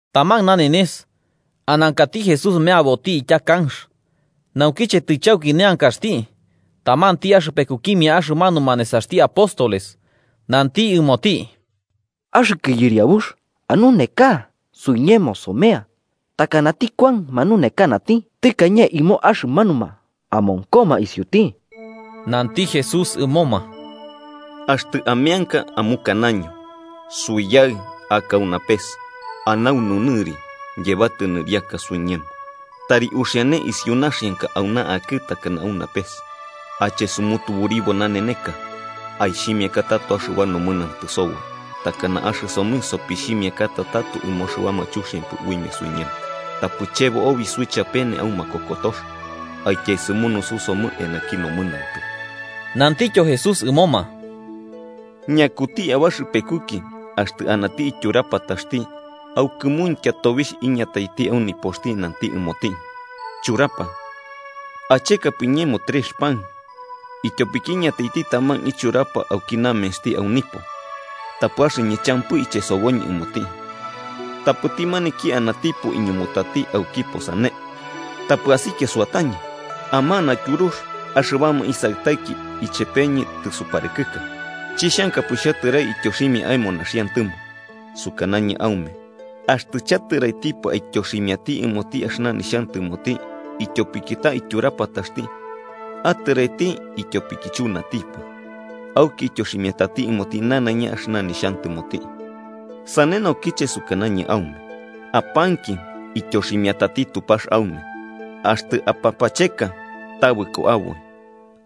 Taman nanenes, anankati Jesús meaboti itya kanx. Naukiche tɨchauki neankaxti, tamanti axɨpekukimia axɨmanuma nesaxti apóstoles nanti ɨmoti: –Axɨkɨ Yɨriabux, anuneka suiñemo somea, takanati Kuan manunekanati tɨkañe ɨmo axɨmanuma amonkoma isiuti. Nanti Jesús ɨmoma: –Axtɨ ameanka, amukanaño: ‘Suiyaɨ, aka au napes anaunu nɨri, yebatɨ nɨriaka suiñemo. Tari uxiane isiu naxianka auna akɨ takana au napes. Ache sumutuburibo naneneka. Aixhimiaka tato axɨba nomɨnantɨ soboi, takana axɨsomɨ sopixhimiakata tato ɨmo axɨbama chuxiampɨ uimia suiñemo. Tapɨ chebo obi suichapene au makokotox, aityaesɨmunususomɨ eanaki nomɨnantɨ.’ Nantityo Jesús ɨmoma: –Ñakuti abaxɨpekuki axtɨ anati tyurapataxti, au kɨmuintya tobixh iñataiti au nipoxti nanti ɨmoti: ‘Churapa, achekapɨ iñemo trex pan, ityopiki iñataiti taman ichurapa auki namensti au nipo, tapɨ axɨñɨ champɨ ichesoboñɨ ɨmoti.’ Tapɨti maniki anatipo iñumutati aukipo sane: ‘Tapɨ asikia suatañɨ. Amana tyurux, axɨbama isaɨtaiki ichepeñɨ tɨsuparɨkɨka. Chixhankapɨ xhatɨrai ityoximia aemo naxiantɨmo.’ Sukanañɨ aume, axtɨ chatɨraitipɨ aityoximiati ɨmoti axɨna nixhantɨmoti ityopiki ta ityurapataxti, atɨraiti ityopiki chunatipɨ, auki ityoximiatati ɨmoti nanaiña axɨna nixhantɨmoti. Sane naukiche sukanañɨ aume: Apanki, ityoximiatati Tupax aume. Axtɨ apapacheka, tabɨko aboi.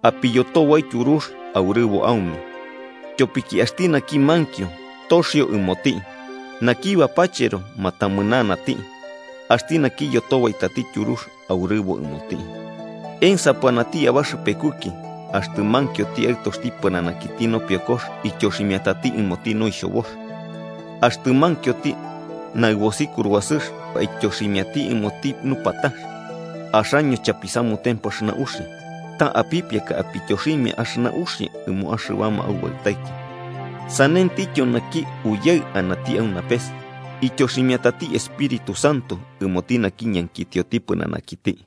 Apiyotobai tyurux, aurɨbo aume. Tyopiki axti naki mankio, toxio ɨmoti. Naki bapachero, matamɨnanati. Axti naki iyotobaitati tyurux, aurɨbo ɨmoti. “¿Ensapɨ anati abaxɨpekuki, axtɨ mankioti aɨtoxti pɨnanakiti nopiokox ityoximiatati ɨmoti noixhobox, axtɨ mankioti naɨbosi kuruasɨx aityoximiati ɨmoti nupatax? Axaño, chapisamutempɨ axɨna uxia, ta apipiaka apityoximia axɨna uxia ɨmo axɨbama aubaɨtaiki, ¡sanentityo naki Uyaɨ anati au napes ityoximiatati Espíritu Santo ɨmoti naki ñankitioti pɨnanakiti!”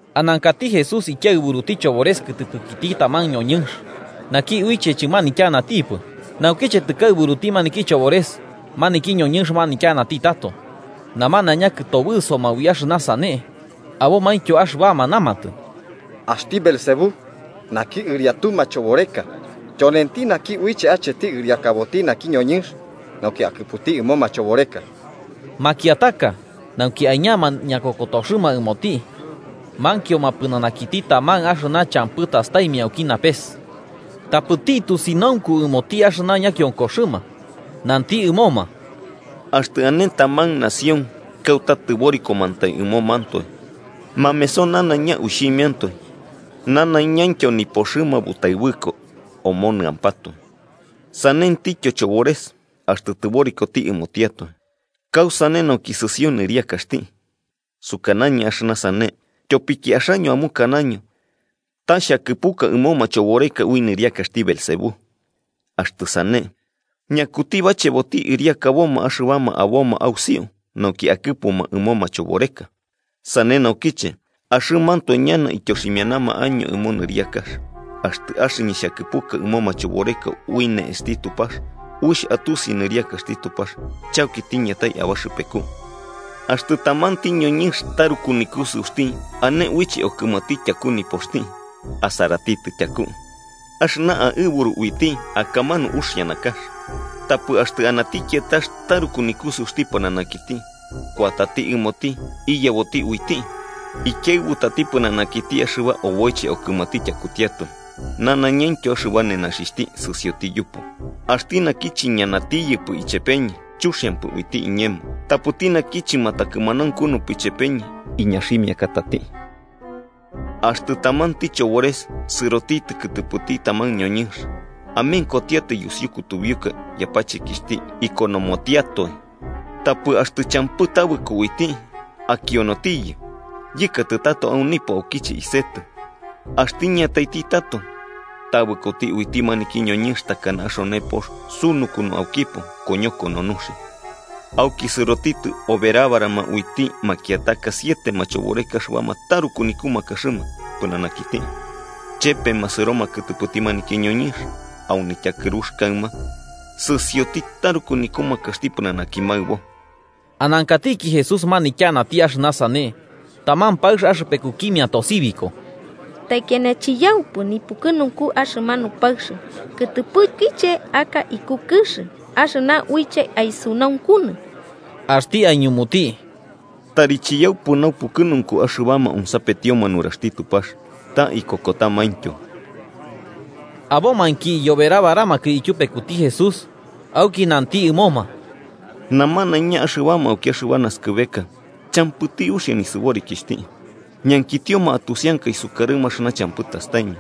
Anankati Jesús ikiaɨburuti chobores kɨtɨpɨkiti taman ñoñɨnx naki uiche chɨmanityanatipɨ. Naukiche tɨkaɨburuti maniki chobores, maniki ñoñɨnx manityanati tato. Namanaiña kɨtobɨsoma ui axɨna sane, abomaintyo axɨbama namatɨ: “Axti Beelzebú, naki ɨriatu machoboreka, tyonenti naki uiche acheti ɨriakaboti naki ñoñɨnx nauki akɨputi ɨmo machoboreka.” Makiataka, nauki aiñama ñakokotoxɨma ɨmoti, mankioma pɨnanakiti taman axɨna champɨ tastaimia auki napes. Tapɨti, tusinaunku ɨmoti axɨna ñakionkoxɨma, nanti ɨmoma: “Axtɨ ane taman nación kauta tɨborikomantai ɨmomantoe, mameso nanaiña uixhimiantoe nanaiñaintyo nipoxɨma butaɨbɨko omonɨampatoe. Sanentityo, chobores axtɨ tɨborikoti ɨmotiatoe, ¿kausane nauki sɨsio nɨriakaxti? Sukanañɨ axɨna sane, tyopiki axaño amukanaño ta xhakɨpuka ɨmo machoboreka ui nɨriakaxti Beelzebú. Axtɨ sane, ¿ñakuti bacheboti ɨriakaboma axɨbama aboma ausiu nauki akɨpuma ɨmoma machoboreka? Sane naukiche, axɨmantoe ñana ityoximianama año ɨmo nɨriakax. Axtɨ axɨñɨ xhakɨpuka ɨmo machoboreka ui ne'esti Tupax, uixh atusi nɨriakaxti Tupax chauki tiñatai abaxɨpeku. “Axtɨ tamanti ñoñɨnx taruku nikusɨuxti ane uiche okɨmati tyaku nipoxti, asaratitɨ tyaku, axɨna aɨburu uiti akamanu uxia nakax. Tapɨ axtɨ anati kiatax taruku nikusɨuxti pɨnanakiti kuatati ɨmoti iyeboti uiti, ikiaɨbutati pɨnanakiti axɨba oboiche okɨmati tyakutiatoe, nanaiñaintyo axɨba nenaxixhti, sɨsioti yupu. “Axti naki chiñanatiyɨpɨ ichepeñɨ, chuxiampɨ uiti iñemo, tapɨti naki chɨmatakɨmanaunkupɨ ichepeñɨ, iñaximiakatati. “Axtɨ tamanti chobores sɨrotitɨ kɨtɨpɨkiti taman ñoñɨnx, amenkotiatai yusiu kutubiuka yapachekixhti ikonomotiatoe. Tapɨ, axtɨ champɨ tabɨko uiti, akionotiyɨ: ‘Yɨkatɨ tato au nipo, aukiche isetɨ.’ Axtɨ iñataiti tato, tabɨkoti uiti maniki ñoñɨnx takana axone pox sunukunu aukipo koñokono nuxia. Auki sɨrotitɨ oberabarama uiti makiataka siete machoboreka axɨbama taruku nikumakaxɨma pɨnanakiti, chepema sɨroma kɨtɨpɨti maniki ñoñɨnx, au nityakɨrux kaɨma sɨsioti taruku nikumakaxti pɨnanaki maɨbo.” Anankatiki Jesús manityanati axɨna sane, taman paɨx axɨpekukimia tosibiko: –¡Taikiana chiyaupɨ nipukɨnunku axɨmanu paɨx kɨtɨpɨkiche aka iku kɨx axɨna uiche aisunaunkunɨ! Axti aiñumuti: –¡Tari chiyaupɨ naupukɨnunku axɨbama onsapetioma nuraxti Tupax, ta ikokotamaityo! Abomainki iyoberabaramakɨ ityupekuti Jesús, auki nanti ɨmoma: “Namanaiña axɨbama auki axɨba naskɨbeka champɨti uxia nisɨborikixhti. Ñankitioma atusianka isukarɨma axɨna champɨ tastaimia,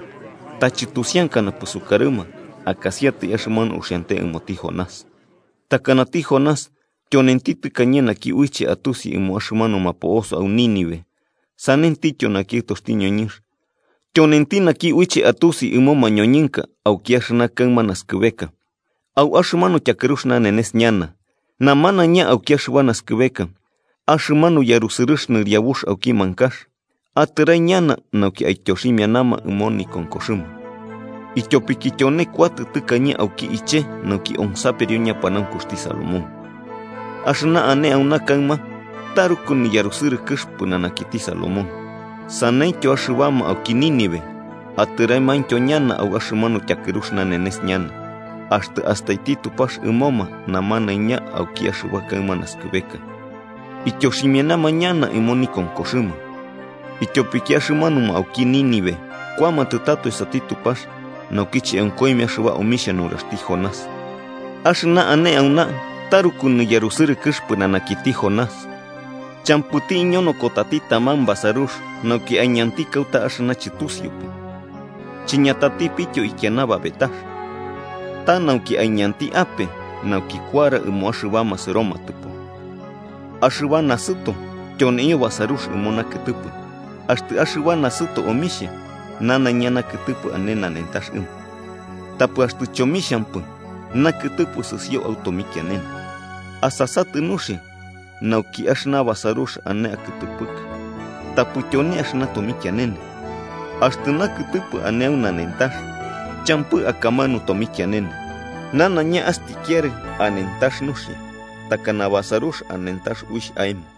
ta chɨtusiankanapɨ sukarɨma akasiatai axɨmanu uxiante ɨmoti Jonás. Takanati Jonás tyonenti tɨkañe naki uiche atusi ɨmo axɨmanuma po'osoma au Nínive, sanentityo naki Aɨtoxti ñoñɨnx tyonenti naki uiche atusi ɨmo mañoñɨnka auki axɨna kaɨma nasɨkɨbeka. Au axɨmanu tyakɨrux nanenes ñana, namanaiña auki axɨba naskɨbeka, axɨmanu yarusɨrɨx nɨriabux auki mankax atɨrai ñana nauki aityoximianama ɨmo nikonkoxɨma. Ityopiki tyone kuatɨ tɨkañe auki iche nauki onsaperio ñapanaunkuxti Salomón, axɨna ane auna kaɨma taruku niyarusɨrɨkɨx pɨnanakiti Salomón. Saneityo axɨbama auki Nínive atɨraimiaintyo ñana au axɨmanu tyakɨrux nanenes ñana, axtɨ astaiti Tupax ɨmoma namanaiña auki axɨba kaɨma naskɨbeka, ityoximianama ñana ɨmo nikonkoxɨma. Ityopiki axɨmanuma auki Nínive kuamatɨ tato esati Tupax naukiche onkoimia axɨba omixhia nuraxti Jonás, axɨna ane auna taruku niyarusɨrɨkɨx pɨnanakiti Jonás. “Champɨti iñonokotati taman basarux nauki aiñanti kauta axɨna chɨtusiupɨ, chiñatatipityo ikiana babetax, ta nauki aiñanti ape, nauki kuara ɨmo axɨbama sɨromatɨpo. Axɨba nasɨto tyoneio basarux ɨmo nakɨtɨpɨ. Axtɨ axɨba nasɨto omixhia, nanaiña nakɨtɨpɨ ane nanentax ɨmo. Tapɨ axtɨ chomixhampɨ, nakɨtɨpɨ sɨsio au tomikianene. Asasatɨ nuxia nauki axɨna basarux ane akɨtɨpɨkɨ tapɨ tyone axɨna tomikianene. Axtɨ nakɨtɨpɨ ane au nanentax champɨ akamanu tomikianene, nanaiña astikiarɨ anentax nuxia, takana basarux anentax uixh aemo.”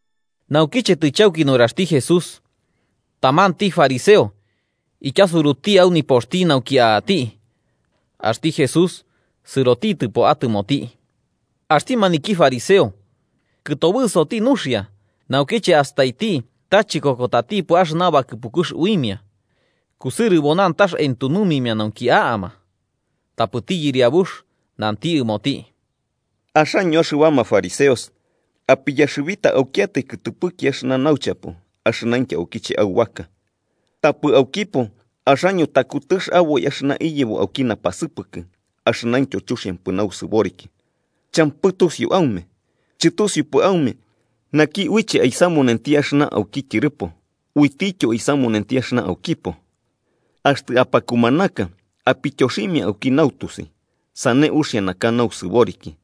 Naukiche tɨchauki nuraxti Jesús, tamanti fariseo ityasuruti au nipoxti nauki a'ati, axti Jesús sɨrotitɨpo atɨmoti. Axti maniki fariseo kɨtobɨsoti nuxia naukiche astaiti ta chikokotatipɨ axɨna bakɨpukux uimia kusɨrɨbo nantax entunumimia nauki a'ama. Tapɨti Yɨriabux nanti ɨmoti: –Axaño axɨbama fariseos apiyaxɨbita aukiatai kɨtɨpɨki axɨna nauchapo axɨnaintyo aukiche aubaka, tapɨ aukipo axaño takutɨx aboi axɨna iyebo auki napasɨpɨkɨ axɨnaintyo chuxiampɨ nausɨboriki. ¡Champɨ tusiu aume! ¿Chɨtusiupɨ aume naki uiche aisamunenti axɨna auki tyɨrɨpo, uitityo aisamunenti axɨna aukipo? Axtɨ apakumanaka apityoximia auki nautusi, sane uxia naka nausɨboriki.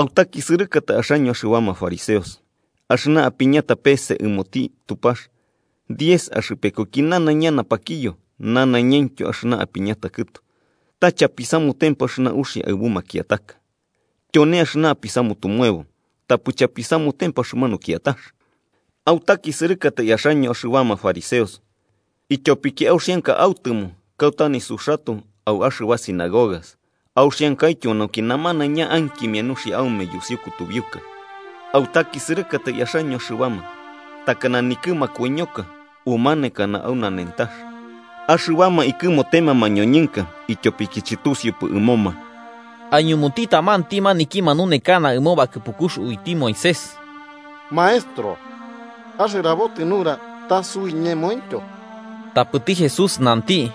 “¡Autakisɨrɨkatai, axaño axɨbama fariseos!, axɨna apiñata peese ɨmoti Tupax diez axɨpekuki nanaiña napakiyo, nanaiñaintyo axɨna apiñata kɨtu, ta chapisamutempɨ axɨna uxia aɨbu makiataka. Tyone axɨna apisamutumuebo, tapɨ chapisamutempɨ axɨmanu kiatax. “¡Autakisɨrɨkatai axaño axɨbama fariseos!, ityopiki auxianka autɨmo kauta nisuxatoe au axɨba sinagogas, auxiankaityo nauki namanaiña ankimia nuxia aume yusiu kutubiuka. “¡Autakisɨrɨkatai, axaño axɨbama takana nikɨ makoiñoka umanekana au nanentax, axɨbama ikɨmotema mañoñɨnka ityopiki chɨtusiupɨ ɨmoma!” Aiñumuti tamanti maniki manunekana ɨmo bakɨpukux uiti Moisés: –Maestro, axɨrabotɨ nura ta suiñemointyo. Tapɨti Jesús nanti: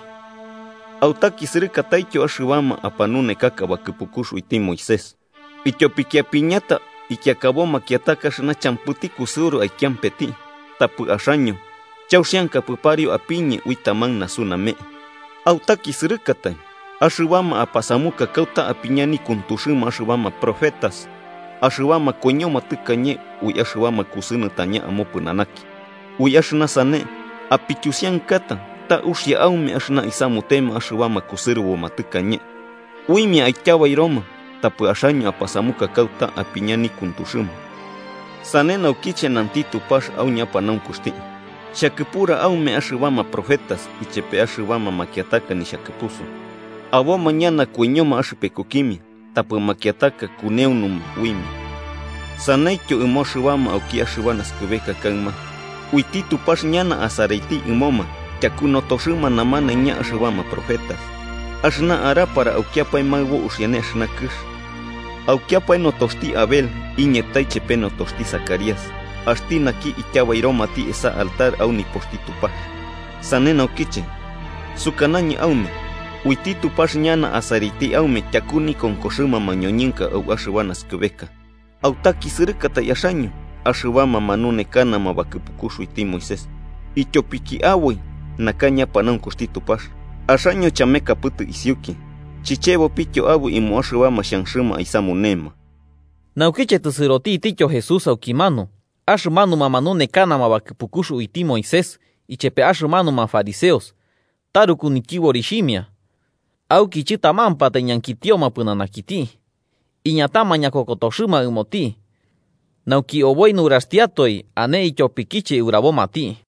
–¡Autakisɨrɨkataityo, axɨbama apanunekaka bakɨpukux uiti Moisés!, ityopiki apiñata ikiakabo makiataka axɨna champɨti kusɨuru aikiampeti, tapɨ axaño chauxiankapɨ pariu apiñe ui taman nasu name'e. “¡Autakisɨrɨkatai!, axɨbama apasamuka kauta apiña nikuntuxɨma axɨbama profetas axɨbama koiñoma tɨkañe ui axɨbama kusɨnɨtaña amopɨnanaki. Ui axɨna sane apityusiankata ta uxia aume axɨna isamutema axɨbama kusɨrɨbo tɨkañe, uimia aityabairoma tapɨ axaño apasamuka kauta apiña nikuntuxɨma. “Sane naukiche, nanti Tupax au ñapanaunkuxti: ‘Xhakɨpura aume axɨbama profetas ichepe axɨbama makiataka nixhakɨpusu, aboma ñana koiñoma axɨpekukimia tapɨ makiataka kuneunuma uimia.’ Saneityo ɨmo axɨbama auki axɨba naskɨbeka kaɨma uiti Tupax ñana asaraiti ɨmoma tyaku notoxɨma namanaiña axɨbama profetas, axɨna arapara aukiapae maɨbo uxiane axɨna kɨx, aukiapae notoxti Abel iñatai chepe notoxti Zacarías, axti naki ityabairomati esa altar au nipoxti Tupax. Sane naukiche, sukanañɨ aume uiti Tupax ñana asaraiti aume tyaku nikonkoxɨma mañoñɨnka au axɨba naskɨbeka. “¡Autakisɨrɨkatai axaño, axɨbama manunekanama bakɨpukux uiti Moisés!, ityopiki aboi naka ñapanaunkuxti Tupax. Axaño chamekapɨtɨ isiuki chichebopityo aboi ɨmo axɨbama xhanxɨma aisamunema.” Naukiche tɨsɨrotitityo Jesús aukimanu, axɨmanuma manunekanama bakɨpukux uiti Moisés ichepe axɨmanuma fariseos taruku nityɨborixhimia, auki chɨtamampatai ñankitioma pɨnanakiti, iñatama ñakokotoxɨma ɨmoti nauki oboi nuraxtiatoe ane ityopikiche urabomati.